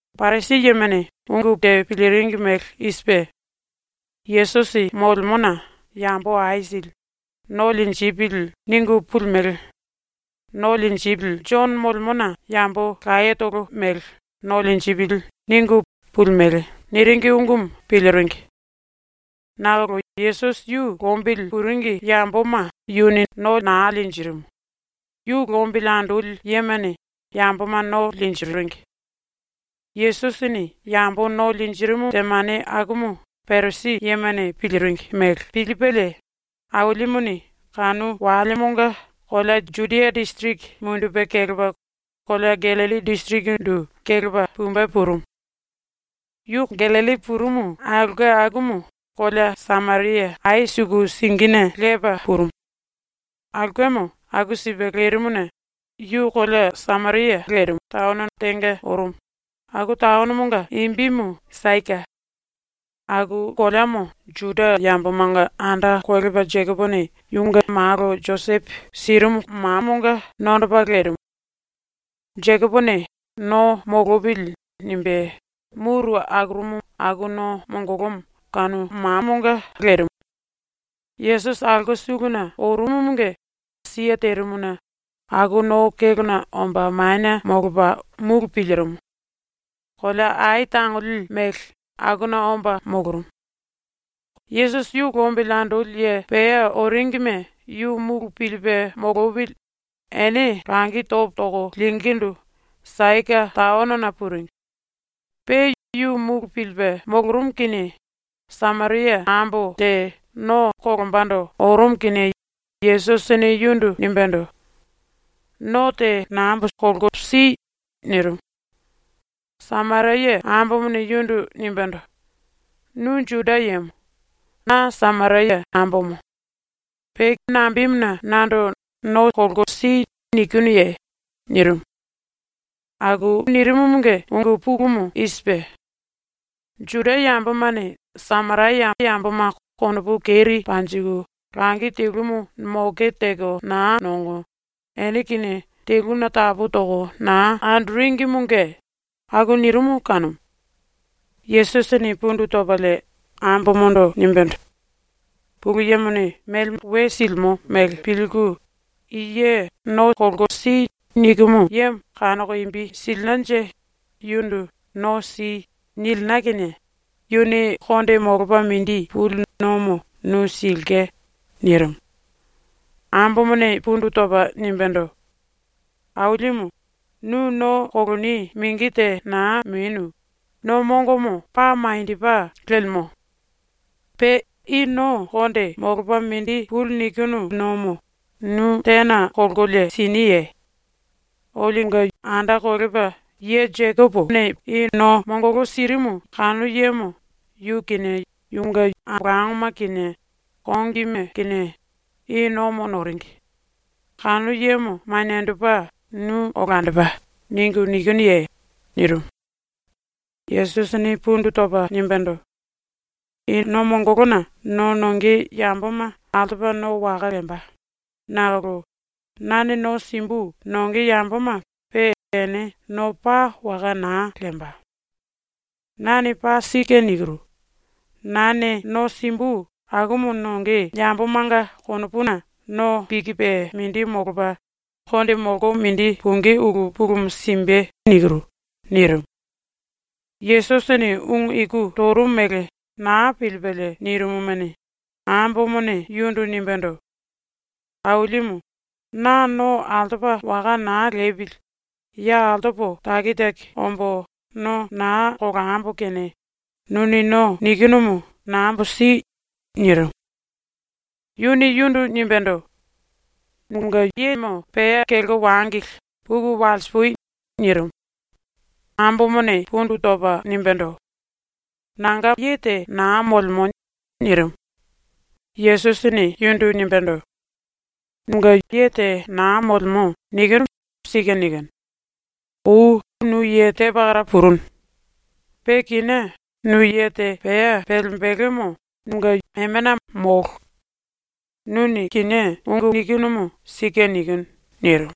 Parisi yemane ungu te piliringi mele i sipe: “Yesusi molemona yambo aisili ‘No linjipili.’ ningu pulimele Jono molemona yambo layetolo mele ‘No linjipili.’ ningu pulimele.” niringi ungumu piliringi. (Nakolo Yesusi yu lombili puringi yamboma yuni no naa linjirimu, yu lombili andoli yemane yamboma no linjiringi.) ⸤Yesusini yambo no linjirimu⸥ temane akumu Parisi yemane piliringi mele pilipelie Ailimuni kanu walemonga kolea Judia disiriki mundupe kelepa kolea Gallilli disirikindu kelepa pumbe purumu. Yu Gallilli purumu aulke akumu kolea Sameria ai suku singine lepa purumu. Aulkemo aku sipe lerimuna yu kolea Sameria taono tenga orumu, aku taonomonga imbimu Saika. Aku koleamo Juda yambomanga anda kolepa Jekopone yunge malo Josepo sirimu mamonga nondopa lerimu. Jekopone ‘No molopili.’ nimbe muru akurumu aku no mongolomo kanu kolea Saika lerimu. Yesusi aulke suluna orumumunge siye terimuna aku no kélona omba manie molopa mulu pilirimu. Kolea ai tangoli mele akuna omba molorumu. (Yesusi yu lombili andoli ye pea oringime yu mulu pilipe molopili ene langi topo toko lingíndu Saika taonona puringi.) Pe yu mulu pilipe molorumu kinie Sameria ambo te no kolombando orumu kinie Yesusini yundu nimbendo: “No te nambo si.” nirimu. Sameria ambomone yundu nimbendo: “Nu Juda yemo. Na Sameria ambomo. Pe nambemuna nando “No si.” nikinuye?” nirimu. (Aku nirimumunge ungu pulumu i sipe: Juda yambomane Sameria yamboma konopu keri panjiku langi telumu moke teko naa nongo, ene kinie teluna tapu toko naa andoringimunge aku nirimu kanumu.) Yesusini pundu topalie ambomondo nimbendo: “Pulu Yemone melemo we silimo mele pilku, i ye “No si.” nikimu yemo kanoko imbi silinanje yundu “No si.” nilina kinie yuni konde molopa mindi puli nomo nu silke.” nirimu. Ambomone pundu topa nimbendo: “Ailimu, nu no koloni mingi te naa menu, no mongomo paa maniendopa lemo. Pe i no konde molopa mindi puli nikinu nomo nu tena kolkolie siniye? Olionga anda kolepa i no mongolo sirimu ye Jekopo, yu kinie yunge ambolangoma kinie kongime kinie i nomo noringi, ‘kanu yemo maniendopa nu olandopa.’ ningu nikinuye?” nirimu. Yesusini pundu topa nimbendo: “I no mongolona no nonge yamboma altopa no waka lemba, nakolo nane no simbu nonge yamboma pe ene no paa waka naa lemba. Nane paa sike nikiru: Nane no simbu akumu nonge yambomanga konopuna no pikipe mindi molopa, konde molko mindi pungí ulu pulumu simbe.” nirimu. ⸤Yesusini ungu iku torumu mele naa pilipelie nirimumuni,⸥ ambomone yundu nimbendo: “Ailimu, na no altopa waka naa lepili, ya altopo taki taki ombo no naa kolambo kene nuni no nikinumu nambo si.” nirimu. Yuni yundu nimbendo: “Nunge yemo pea kelko wangili, puku walsipui.” nirimu. Ambomone pundu topa nimbendo: “Nanga ye te naa molemo.” nirimu. Yesusini yundu nimbendo: “ “Nunge ye te naa molemo.” nikinumu sike nikinu. Ou nu ye te pakara purunu. Pe kinié nu ye te pea pelembelemo nunge emena molo. Nuni kinié ungu nikinumu sike nikinu.” nirimu.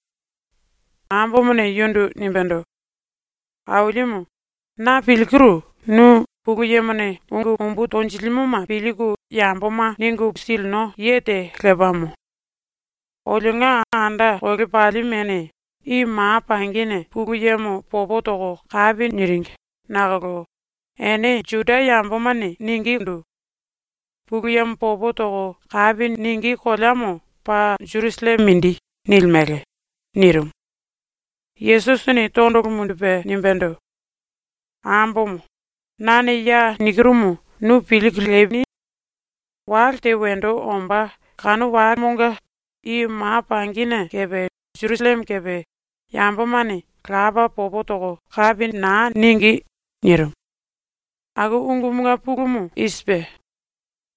Ambomone yundu nimbendo: “Ailimu, na pilkiru nu Pulu Yemone ungu umbu tonjilimoma pilku yamboma ningu silino ye te lepamo. Olionga anda kolepalimene i ma pangine Pulu Yemo popo toko kapi niringi nakolo ene Juda yambomane ningindu: “Pulu Yemo popo toko kapi ningí koleamo paa Jerusalleme mindi.” nilimele.” nirimu. Yesusini tondolo mundupe nimbendo: “Ambomo, nane ya nikirumu nu pilku lini. Wale te wendo ombá kanu walemonga i ma pangine kepe Jerusalleme kepe yambomane Lapa popo toko kapi naa ningí.” nirimu. ⸤Aku ungumunge pulumu: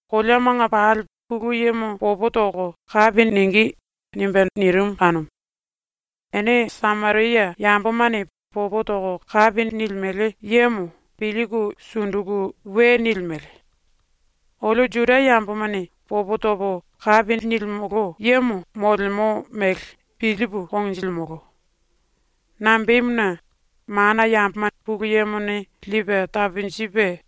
“Koleamanga pali Pulu Yemo popo toko kapi ningí.” nirimu kanumu.⸥ “Ene Sameria yambomane popo toko kapi nilimele yemo pilku sunduku we nilimele. Olio Juda yambomane popo topo kapi nilimolo yemo molemo mele pilipu konjilimolo. Nambemuna, mana yamboma Pulu Yemone lipe taponjipe,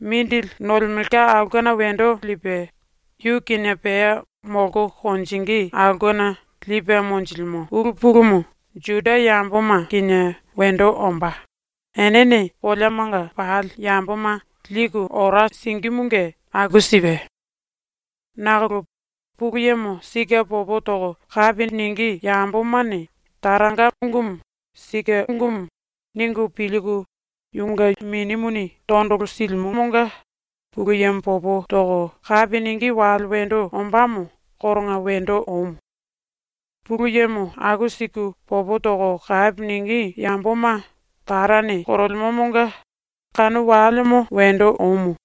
mindili nolemelka aulkena wendo lipe, yu kinie pea molko konjingí aulkena lipe monjilimo ulu pulumu Juda yamboma kinie wendo ombá, enene koleamanga pali yamboma liku ora singímunge aku sipe. Nakolo Pulu Yemo sike popo toko kapi ningí yambomane Taranga ungumu ‘Sike ungumu.’ ningu pilku yunge Minimuni tondolo silimomonga Pulu Yemo popo toko kapi ningí wale wendo ombámo koronga wendo omu. Pulu Yemo aku siku popo toko kapi ningí yamboma Tarane korolemomonga kanu walemo wendo omu.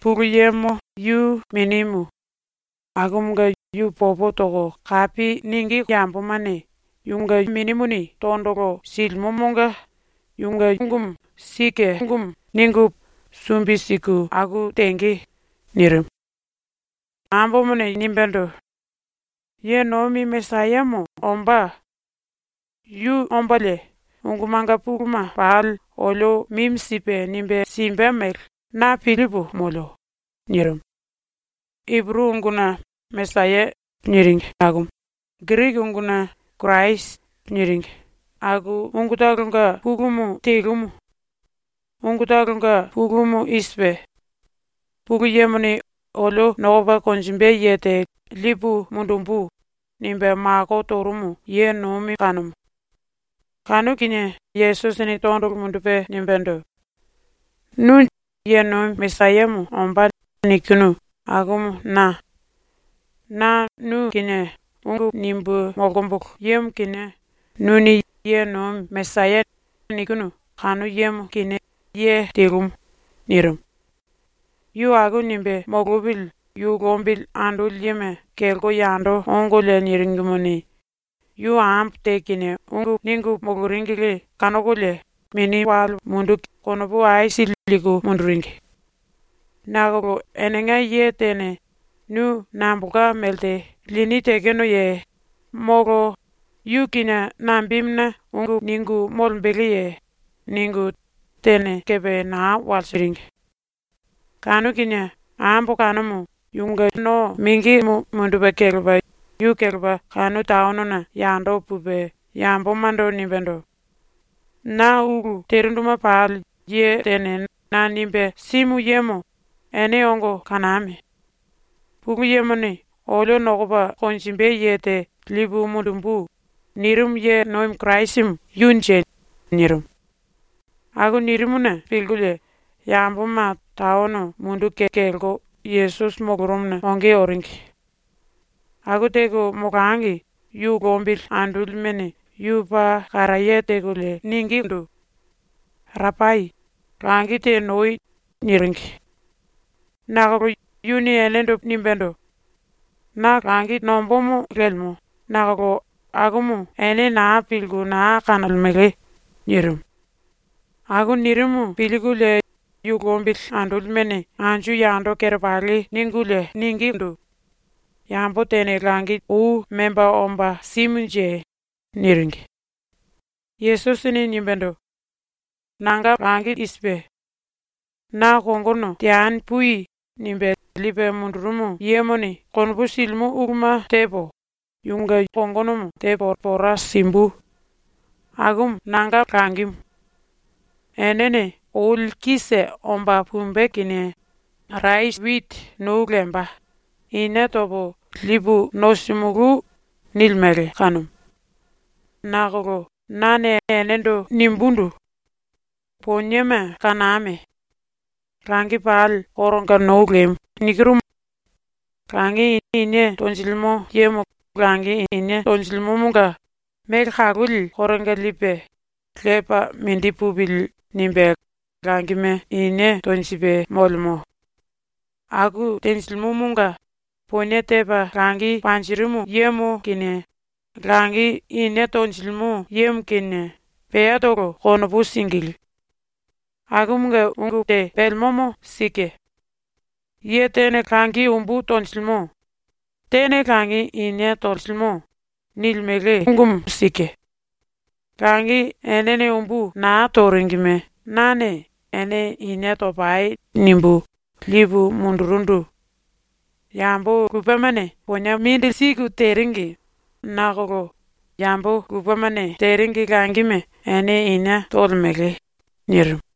Pulu Yemo yu minimu, akumunge yu popo toko kapi ningí yambomane yunge Minimuni tondolo silimomonga ‘Yunge ungumu sike ungumu.’ ningu sumbi siku aku tenge.” nirimu. Ambomone nimbendo: “Ye nomi Mesayamo ombá. Yu ombalie ungumanga puluma pali olio mimi sipe nimbe simbe mele na pilipu molio.” nirimu. (Ipuru unguna ‘Mesaya’ niringi akumu, Giriki unguna ‘Kirasi’. niringi aku ungutolonga pulumu telumu. Ungutolonga pulumu i sipe: Pulu Yemone “Olio nokopa konjimbe ye te lipu mundumbu.” nimbe mako torumu ye nomi kanumu.) Kanu kinie Yesusini tondolo mundupe nimbendo: “Nu “Ye nomi Mesayamo ombá.” nikinu akumu na. Na nu kinie ungu nimbu molkombolo yemo kinie, nuni “Ye nomi Mesaya” nikinu kanu yemo kinie, ye telumu.” nirimu. Yu aku nimbe molopili yu lombili andoli yema kelko yando ongolie niringimuni, yu ambo te kinie ungu ningu moloringili kanokolie konopu aisili liku munduringi. Nakolo enenga ye tene “Nu nambolka melte lini tekenoye?”, molo “Yu kinie nambemuna ungu ningu molembeleye?” ningu tene kepe naa walsiringi. Kanu kinie ambo kanumu yunge no mingimu mundupe kelepa yu kelepa kanu taonona yando pupe yambomando nimbendo: “Na ulu terinduma pali ye tene na nimbe simu yemo ene ongo kaname! Pulu Yemone “Olio nokopa konjimbe ye te lipu mundumbu.” nirimu ye nomi Kirasimu yunje.” nirimu. Aku nirimuna pilkulie yamboma taono munduku kelko Yesusi molorumuna onge oringi. Aku teko molangi yu lombili andolimene yu paa karaye tekolie ningindu: “Rapai, langi te nou.” niringi. Nakolo yuni enendo nimbendo: “Na langi nombómo lemo, nakolo akumu ene naa pilku naa kanolemele.” nirimu. Aku nirimu pilkulie yu lombili andolimene anju yando kerepali ningulie ningindu: “Yambo tene langi ou memba omba simunje?” niringi. Yesusini nimbendo: “Nanga langi i sipe: Na ‘kongono teani pui.’ nimbe lipe mundurumu yemone konopu silimo uluma tepo, yunge kongonomo tepo pora simbu. Akumu nanga langimu. Enene “Oli kise omba pumbe kinie rasi witi nou lemba, inie topo lipu nosimulú.” nilimele kanumu. Nakolo nane enendo nimbundu: Poniema kaname! Langi pali koronga nou lemu. Langi inie tonjilimo yemo langi inie tonjilimomonga mele kaloli koronga lipe, ‘Lepa mindi pupili.’ nimbe langime inie tonjipe molemo. Aku tenjilimomonga ponie tepa langi panjirimu yemo kinie langi inie tonjilimo yemo kinie peatolo konopu singilí. Akumunge ungu te pelemomo sike. ‘Ye tene langi umbu tonjilimo. Tene langi inie tolemo.’ nilimele ungumu sike. Langi enene umbu naa toringime nane “Ene inie topai.” nimbu lipu mundurundu. Yambo lupemane ponie mindili siku teringi, nakolo yambo lupemane teringi langime ene inie tolemele.” nirimu.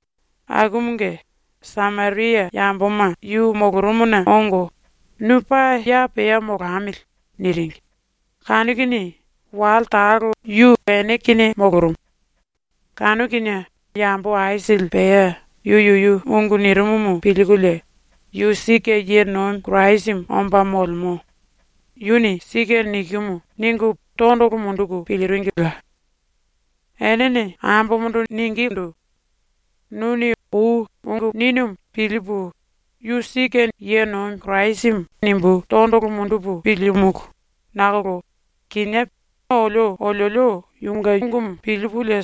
Akumunge Sameria yamboma yu molorumuna ongo, “Nu paa ya pea molamili.” niringi, kanu kinie wale talo yu ene kinie molorumu. Kanu kinie yambo aisili pea yu yuyu ungu nirimumu pilkulie ‘Yu sike ⸤ye nomi Kirasimu omba molemo. Yuni sike nikimu.⸥’ ningu tondolo munduku piliringila. Enene ambomondo ningindu: “Nuni ou ungu ninumu pilipu ‘Yu sike.’ nimbu tondolo mundupu pilímulu nakolo kinié olio oliolio yunge ungumu pilipulie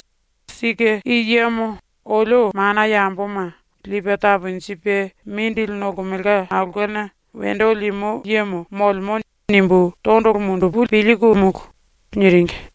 ‘Sike i yemo olio mana yamboma Lipe Taponjipe Mindili Nolemelka Aulkena Wendo Limo Yemo molemo.’ nimbu tondolo mundupu pilimolo.” niringi.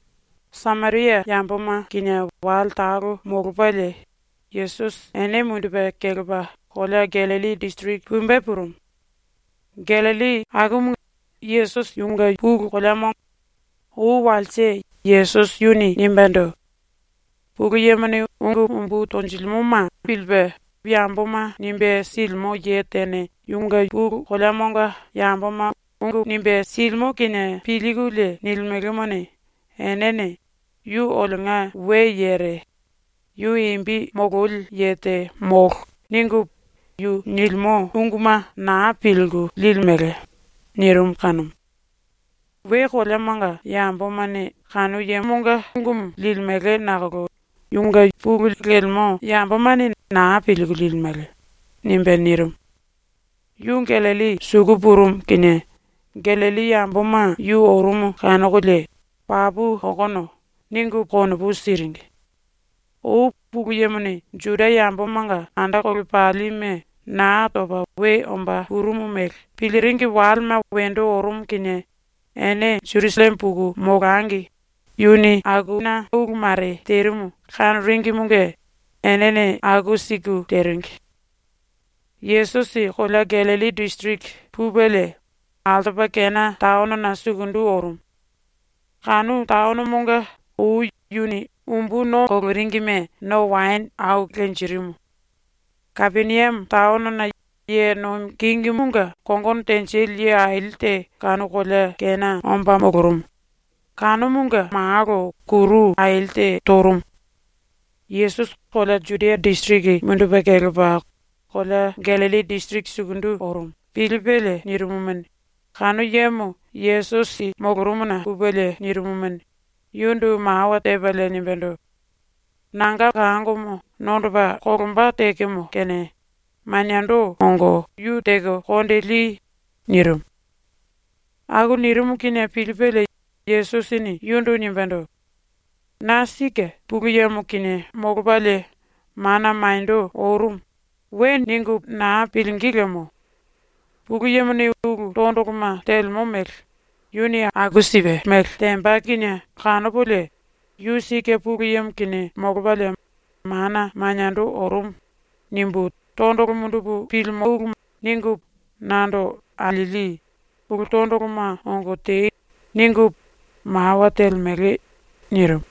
Sameria yamboma kinie wale talo molopalie Yesusi ene mundupe kelepa kolea Gallilli disiriki pumbe purumu. (Gallilli Yesusi yunge pulu koleamo. Ou walse Yesusi yuni nimbendo: “Pulu Yemone ungu umbu tonjilimoma pilipe yamboma nimbe silimo ye tene yunge pulu koleamonga yamboma ungu nimbe silimo kinie pilkulie nilimelemone, enene ‘Yu olionga we yere. Yu imbi mololi ye te molo.’ ningu yu nilimo unguma naa pilku liku su silimele.” nirimu kanumu.) ⸤‘We koleamanga yambomane kanu yemonga ungumu limele nakolo yunge pulu lemo yambomane naa pilku limele.’ nimbe nirimu.⸥ Yu Gallilli suku purumu kinie Gallilli yamboma yu orumu kanokolie “Papu okono.” ningu konopu siringi. Ou Pulu Yemone Juda yambomanga anda kolepalime Naa Topa We Omba Purumu mele piliringi walema wendo orumu kinie ene Jerusalleme puku molangi yuni akuna ulu mare terimu kanoringimunge enene aku siku teringi. Yesusi kolea Gallilli disiriki pupelie altopa Kena taonona sukundu orumu. Kanu taonomonga ou yuni umbu no koloringime no waene au lenjirimu. Kapeniame taono ye nomi kingimunge kongono tenjili ye aili te kanu kolea Kena molorumu, kanumunge malo kuru aili te torumu. ‘Yesusi kolea Judia disiriki mundupe kelepa kolea Gallilli disiriki sukundu orumu.’ pilipelie nirimumuni, kanu yemo Yesusi molorumuna pupelie nirimumuni, yundu mawa tepalie nimbendo: “Nanga kangomo nondopa kolomba tekemo kene maniendo ongo yu teko konde li.” nirimu. Aku nirimu kinie pilipelie Yesusini yundu nimbendo: “‘Na sike ⸤Pulu Yemo kinie molopalie mana maniendo orumu⸥.’ we ningu naa pilingí lemo. Pulu Yemone ulu tondoloma telemo mele ‘Yuni aku sipe mele temba kinie kanopolie ‘Yu sike ⸤Pulu Yemo kinie molopalie mana maniendo orumu⸥.’ nimbu tondolo mundupu pilimolo.’ ningu nando alieli “Ulu tondoloma ongo tei.” ningu mawa telemele.”. nirimu.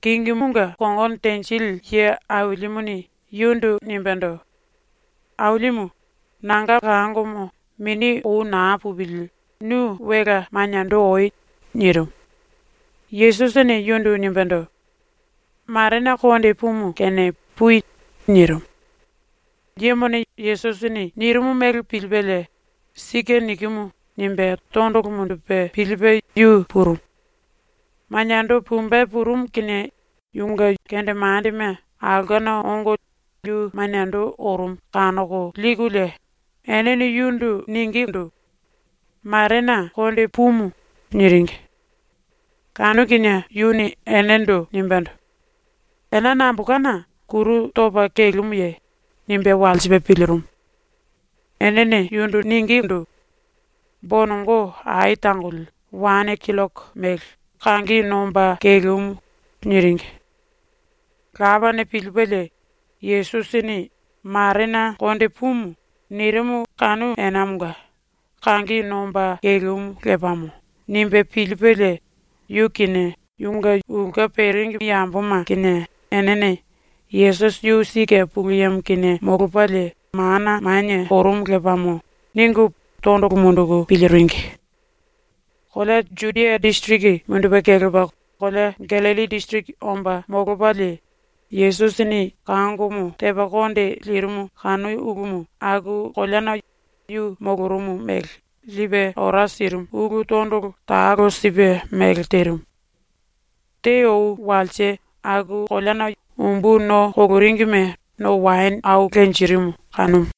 Kingimunge kongono tenjili ye ailimuni yundu nimbendo: “Ailimu, nanga kangomo mini ou naa pupili nu welea maniendo oi.” nirimu. Yesusini yundu nimbendo: “Marena konde pumu kene pui.” nirimu. Yemone Yesusini nirimu mele pilipelie ‘Sike nikimu.’ nimbe tondolo mundupe pilipe yu purumu. Maniendo pumbe purumu kinie yunge kendemandema aulkena ongo yu maniendo orumu kanoko likulie enene yundu ningindu: “Marena konde pumu.” niringi. Kanu kinie yuni enendo nimbendo: “Ena nambolkana kuru topa kelemuye?” nimbe walsipe pilirimu. Enene yundu ningindu: “Bonongo ai tangoli wane killoko mele kangi nomba kelemu.” niringi. Lapane pilipelie Yesusini “Marena konde pumu.” nirimu kanu enamonga ‘Kangi nomba kelemu lepamo.’ nimbe pilipelie, yu kinie yunge ulke peringi yamboma kinie enene ‘Yesusi yu sike ⸤Pulu Yemo kinie molopalie mana manie orumu lepamo⸥.’ ningu tondolo munduku piliringi. Kolea Judia disiriki mundupe kelepa kolea Gallilli disiriki omba molopalie Yesusini kangomo tepa konde lirimu kanu ulumu aku koleana yu molorumu mele lipe ora sirimu ulu tondolo talo sipe mele terimu. Te ou walse aku koleana umbu no koloringime no waene au lenjirimu kanumu.